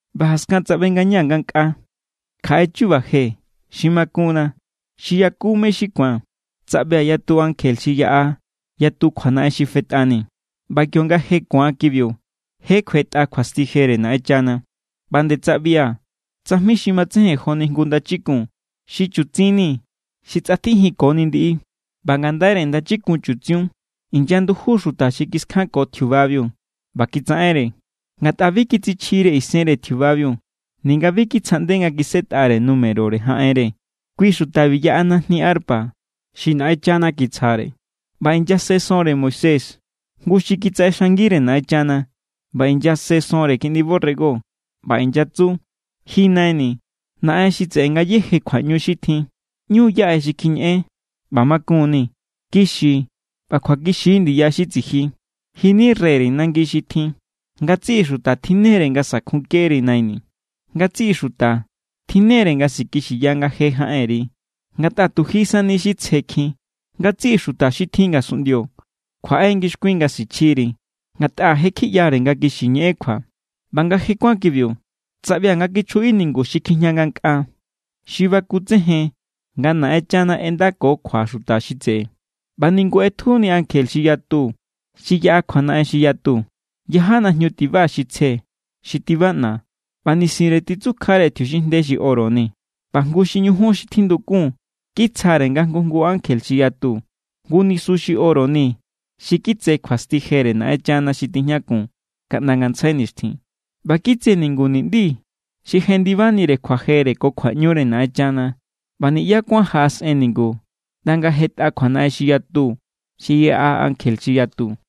ꞌBa jaskan tsaꞌbe ngañaa̱ ngankꞌaa kjaꞌe chu̱ba̱ je xi makunna, xi yaku mé= xi ku̱an. Tsaꞌbia̱ yatu ankje xi yaꞌa yatu kjuanaꞌen xi fetꞌani, ꞌba kionga je ku̱an kibiu, je kjuetꞌa kjuasti jere Naꞌenchana. ꞌBa nde tsaꞌbia̱ tsajmi xi matsejen joni jngu ndachikun xi chutsin ni xi tsꞌatjijinkoni ndiꞌi. ꞌBa ngandaire ndachikun chutsiun inyanduju xuta xi kiskjanko tjiubabiu ꞌba kitsaꞌenre. Ngatꞌa bi kitsichjire isenre tjiubabiu ninga bi kitsjaꞌnde nga kisꞌetꞌare numerore jaꞌenre. Kui xutabiu yaꞌa najni arpa xi Naꞌenchana kitsjare. ꞌBa inyase sonre Moisés, jngu xi kitsaꞌexangire Naꞌenchana, ꞌba inyase sonre Kiꞌndi borrego. ꞌBa inyatsu: Ji Naini̱, Naꞌen xi tseꞌe ngayéje kjuaꞌñu xi tjin, ꞌñu= yaꞌe xi kjiñeꞌen ꞌba makun=ni. Kixi ꞌba kjuakixi= ndiya xi tsiji. Ji=ni reyre nangi xi tjin. Ngatsiꞌi xuta tjinne=re nga sa̱kjunkeri, Naini̱. Ngatsiꞌi xuta tjinne=re nga sikixiya nga je jaꞌenri. Ngatꞌa tu ji sani xi tsjekjin. Ngatsiꞌi xuta xi tjin ngasunꞌndio kjuaꞌe= ngixkuin nga sichjiri, ngatꞌa je= kjiꞌyare nga kixi ñeꞌen kjua. ꞌBa nga je kuán kibiu, tsaꞌbia̱ nga kichjuꞌi ningu xi kjijña ngankꞌaa, xi bakutsejen nga Naꞌenchana ꞌendako kjua xuta xi tseꞌe. ꞌBa ningu ꞌetjuni ankje xi yatu xi yaꞌa kjuanaꞌen xi yatu. Yaja najñu tiba xi tsje xi tibaꞌna, ꞌba nisinre titsukjare tjiuxinjnde xi oro ni. ꞌBa jngu xi ñujun xi tjindukun kitsjare nga jngu jngu ankje xi yatu jngu nisu xi oro ni xi kitse kjuasti jere Naꞌenchana xi tijñakun kaꞌnda ngantsjai nixtjin. ꞌBa kitse ningu niꞌndi xi jendibanire kjuajere ko kjuaꞌñure Naꞌenchana, ꞌba niꞌyá kuán jaꞌasꞌen ningu ꞌnda nga jetꞌa kjuanaꞌen xi yatu xi yaꞌa ankje xi yatu.